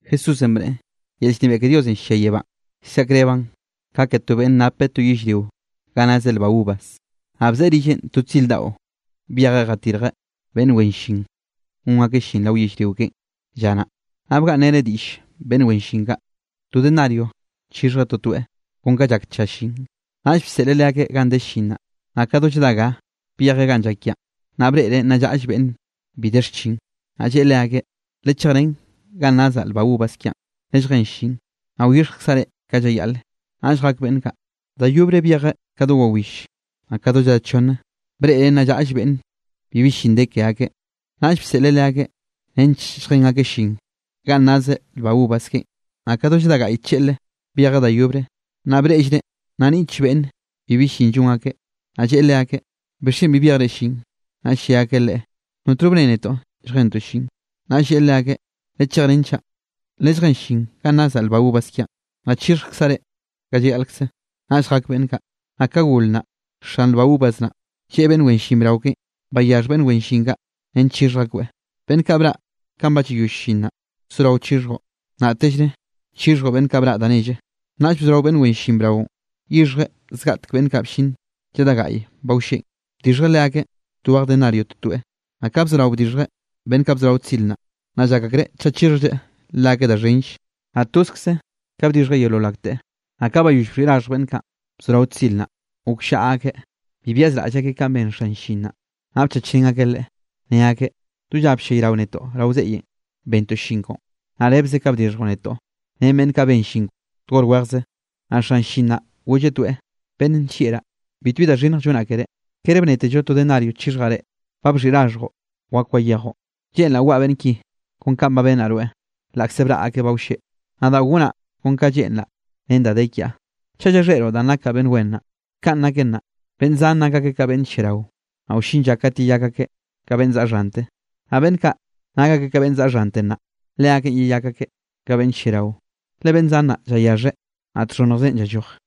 Jesúsenꞌ bneꞌe: —Yel llnebiaꞌ ke Diosenꞌ llia yebánꞌ llsaꞌkrebraꞌn ka ke to beꞌnn napeꞌ to yellrio ga nazeꞌ lba uvas. Naꞌ bzeꞌe rillenꞌ to tzir daꞌo byejeꞌ jatirjeꞌ beꞌnn wen llin gon akeꞌ llin rao yellrio keꞌen lla naꞌ. Naꞌ bgaꞌnnreneꞌ diꞌll beꞌnn wen llin kaꞌ, to denario chixhjeꞌ totoeꞌ, kon ka llak tlla llin. Naꞌll bseꞌleꞌ leakeꞌ ganꞌ de llin naꞌ. Naꞌ ka do lladá ga, byejeꞌ ganꞌ llak yaꞌan, naꞌ breꞌreꞌ nna llaꞌll beꞌnn bi de xchin. Naꞌ lleꞌe leakeꞌ: “Lechejrén ganꞌ nazaꞌ lba uvas kiaꞌn, lelljén llin, naꞌ wyixhjkzaꞌ reꞌ ka llayaꞌle.” Naꞌll jak beꞌnn kaꞌ. Da yobre byejeꞌ ka do wawill, naꞌ ka do lladá chonne. Breꞌreꞌ nna llaꞌll beꞌnne bibi llin de ke akeꞌ, naꞌll bseꞌleꞌ leakeꞌ nench lljen akeꞌ llin ganꞌ nazeꞌ lba uvas keꞌen. Naꞌ ka do lladá gaꞌy tlleꞌlre byejeꞌ da yobre, naꞌ breꞌllreꞌ nna niꞌtll beꞌnne bibi llin llon akeꞌ. Naꞌll lleꞌe leakeꞌ: “¿Bixchen bi byejre llin?” Naꞌll lle akeꞌ leꞌe: “Notno bne netoꞌ lljentoꞌ llin.” Naꞌll lleꞌe leakeꞌ: “Lechejrén chaꞌ, lelljén llin ganꞌ nazaꞌ lba uvas kiaꞌn. Naꞌ chixhjkzaꞌ reꞌ ka llayaꞌlkze.” Naꞌll jak beꞌnn kaꞌ. Naꞌ ka gol naꞌ, xan lba uvas naꞌ, lleꞌe beꞌnn wen llin brao keꞌen: “Bayaxh beꞌnn wen llin kaꞌ nench chixhj akoeꞌ, beꞌnn kaꞌ braꞌ kanꞌ ba llayoll llin naꞌ, soraoꞌ chixhjoꞌ, naꞌtellre chixhjoꞌ beꞌnn kaꞌ braꞌ da nelle.” Naꞌll bzorao beꞌnn wen llin braonꞌ yixhjeꞌ zgaꞌtek beꞌnn kaꞌ bllin lladá gaꞌye ba wlleꞌn, bdixhjeꞌ leakeꞌ twej denario totoeꞌ. Naꞌ ka bzorao bdixhjeꞌ beꞌnn kaꞌ bzorao tzir naꞌ, naꞌ llak akreꞌ chaꞌ chixhjlleꞌ leakeꞌ da xhenllenꞌ. Naꞌ tozkze ka bdixhjeꞌ yeolol akteꞌ. Naꞌ ka bayoll bxhiꞌi raxhj beꞌnn kaꞌ, bzorao tzir naꞌ, gokllaꞌa akeꞌ, bi byazraꞌll akeꞌ kanꞌ ben xan llin naꞌ, naꞌ bchachrén akeꞌ leꞌe. Ne akeꞌ: “Do lla bllayrao netoꞌ rao zeꞌyenꞌ bentoꞌ llin koꞌon, naꞌ rebze ka bdixhjoꞌ netoꞌ ren beꞌnn kaꞌ ben llin to hor wejze.” Naꞌ xan llin naꞌ golleꞌ toeꞌ: “Beꞌnn nllieꞌraꞌ, bitbi da xhinnj llonaꞌ keré. ¿Kere bnetello to denario chixhjaꞌ reꞌ? Ba bxhiꞌi raxhjoꞌ, wak wayejoꞌ, lleꞌnraꞌ waꞌa beꞌnn ki kon kanꞌ ba bennaꞌ rweꞌ, laꞌkze braꞌ akeꞌ ba wlleꞌ. Nadaꞌ gonaꞌ kon ka lleꞌnraꞌ ren da de kiaꞌ. ¿Chaꞌ llakxheꞌroꞌ danꞌ nakaꞌ beꞌnn wen naꞌ?” Kanꞌ naken naꞌ, beꞌnn zan nak akeꞌ ka beꞌnn lliarao, naꞌ wllin lla kat yeyak akeꞌ ka beꞌnn zaꞌa xhante, naꞌ beꞌnn kaꞌ nak akeꞌ ka beꞌnn zaꞌa xhante nnaꞌ, leakeꞌn yeyak akeꞌ ka beꞌnn lliarao. Le beꞌnn zan naꞌ llayaxheꞌ, naꞌ txhonnjzeꞌn llalloj.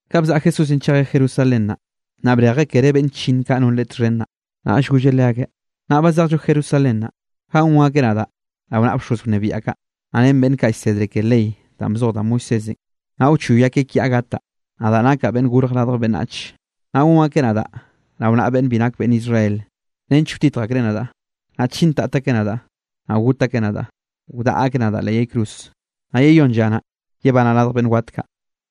Ka bzaꞌa Jesúsenꞌ chejeꞌ Jerusalén naꞌ, naꞌ brejeꞌ kere beꞌnn chllinn kaꞌ non Leꞌe txhen naꞌ, naꞌll golleꞌ leakeꞌ: —Nnaꞌ ba zejllo Jerusalén naꞌ, ganꞌ gon akeꞌ nadaꞌ rao naꞌa bxoz wnebiaꞌ kaꞌ, naꞌ ren beꞌnn kaꞌ llsedre ke ley danꞌ bzoj da Moisésenꞌ, naꞌ wchoy akeꞌ kiaꞌ gataꞌ, nadaꞌ nakaꞌ Beꞌnn Gorj Radj Beꞌnnach. Naꞌ gon akeꞌ nadaꞌ rao naꞌa beꞌnn bi nak beꞌnn Israel nench wtitj akreꞌ nadaꞌ, naꞌ chintat akeꞌ nadaꞌ, naꞌ got akeꞌ nadaꞌ, wdaꞌa akeꞌ nadaꞌ leꞌ yay cruz, naꞌ yeyónn lla naꞌ, yebanaꞌ radj beꞌnn wat kaꞌ.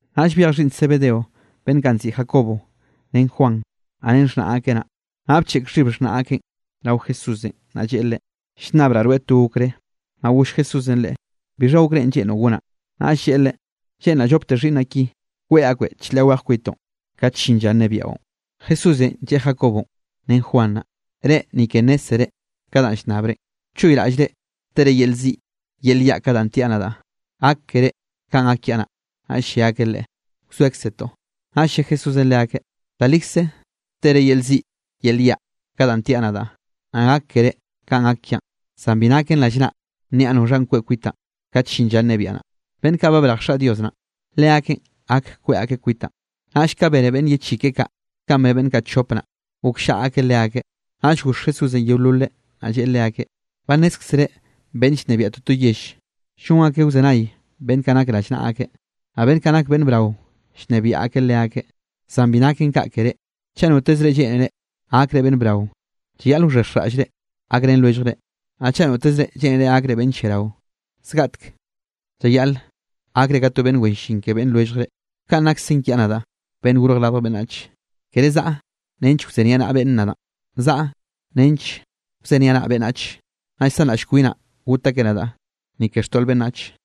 Naꞌll byej xhiꞌnn Zebedeo beꞌnn kaꞌ nziꞌi Jacobo ren Juan, naꞌ ren xhnaꞌ akeꞌ naꞌ, naꞌ bcheꞌk xhib xhnaꞌ akeꞌn rao Jesúsenꞌ. Naꞌ lleꞌe Leꞌe: —Llnnabraꞌ rweꞌ to okré. Naꞌll goll Jesúsenꞌ leꞌe: —¿Bixha okrénꞌ lleꞌnroꞌ gonaꞌ? Naꞌll lleꞌe Leꞌe: —Lleꞌnraꞌ llopte xhiꞌnnaꞌ ki, kweꞌ akbeꞌ chlaꞌ weje kwitoꞌn kate llin lla nnebiaꞌon. Jesúsenꞌ lleꞌe Jacobonꞌ ren Juan naꞌ: —Reꞌ ni ke nnézzere ka danꞌ llnnabrenꞌ. ¿Wchoyraꞌllre tere yel ziꞌ yel yaꞌ ka danꞌ tiaꞌ nadaꞌ, gak keré kanꞌ gak kiaꞌ naꞌ? Naꞌll lle akeꞌ Leꞌe: —Wzoekzetoꞌ. Naꞌll lle Jesúsenꞌ leakeꞌ: —Da likze tere yel ziꞌ yel yaꞌ ka danꞌ tiaꞌ nadaꞌ, naꞌ gak keré kanꞌ gak kiaꞌn, zan bi naken rallnaꞌ nniaꞌ noxhanꞌ kweꞌ kwitaꞌn kat llin lla nnebiaꞌ naꞌ, beꞌnn kaꞌ ba brej Xaꞌ Dios naꞌn, leakeꞌn gak kweꞌ akeꞌ kwitaꞌn. Naꞌll ka bene beꞌnn ye chi keꞌe kaꞌ, kanꞌ bne beꞌnn kaꞌ chop naꞌ, gokllaꞌa akeꞌ leakeꞌ. Naꞌll goxh Jesúsenꞌ yeololeꞌ, naꞌ lleꞌe leakeꞌ: —Ba nnézkzere beꞌnnenꞌ llnebiaꞌ toto yell, llon akeꞌ wzenay beꞌnn kaꞌ nak rallnaꞌa akeꞌ, naꞌ beꞌnn kaꞌ nak beꞌnn brao llnebiaꞌ akeꞌ leakeꞌ. Zan bi naken kaꞌ ke reꞌ, chaꞌ notezre lleꞌnere gakre beꞌnn brao, llayaꞌl wxhexjraꞌllre gakrenre lwelljre. Naꞌ chaꞌ notezre lleꞌnere gakre beꞌnn lliarao, zgaꞌtek llayaꞌle gakre ka to beꞌnn wen llin ke beꞌnn lwelljre. Ka nakzen kiaꞌ nadaꞌ, Beꞌnn Gorj Radj Beꞌnnach, kere zaꞌa nench wzeniaꞌnaꞌa beꞌnne nadaꞌn, zaꞌa nench wzeniaꞌnaꞌ beꞌnnach, naꞌ llsanraꞌll kwinaꞌ got akeꞌ nadaꞌ ni ke xtoꞌl beꞌnnach.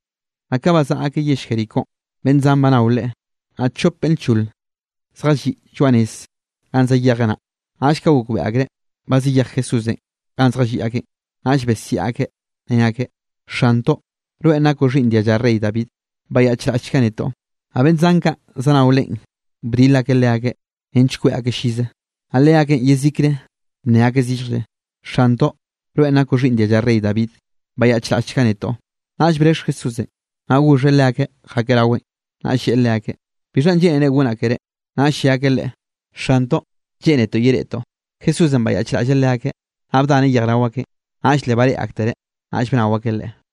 Naꞌ ka bazaꞌa akeꞌ yell Jericónꞌ beꞌnn zan ba nao Leꞌe. Naꞌ chop beꞌnn lchol zjalliꞌ lloaꞌ nez ganꞌ zayejeꞌ naꞌ, naꞌll ka gokbeꞌe akreꞌ ba zayej Jesúsenꞌ ganꞌ zjalliꞌ akeꞌn, naꞌll besiaꞌ akeꞌ ne akeꞌ: —¡Xantoꞌ, rweꞌn nakoꞌ xhiꞌnn dialla rey David! ¡Bayaꞌchraꞌllchga netoꞌ! Naꞌ beꞌnn zan kaꞌ zanao Leꞌen bdil akeꞌ leakeꞌ nench kweꞌ akeꞌ llize. Naꞌ leakeꞌn yezikre bnne akeꞌ zilljlle: —¡Xantoꞌ, rweꞌ nakoꞌ xhiꞌnn dialla rey David! ¡Bayaꞌchraꞌllchga netoꞌ! Naꞌll brexh Jesúsenꞌ, naꞌ goxheꞌ leakeꞌ jakeꞌ raweꞌn, naꞌll lleꞌe leakeꞌ: —¿Bixhanꞌ lleꞌnere gonaꞌ ke reꞌ? Naꞌll lle akeꞌ Leꞌe: —Xantoꞌ, lleꞌnetoꞌ yereꞌtoꞌ. Jesúsenꞌ bayaꞌchraꞌlleꞌ leakeꞌ, naꞌ bdaneꞌ yejrao akeꞌn, naꞌll le bareꞌe aktereꞌ, naꞌll bnao akeꞌ Leꞌe.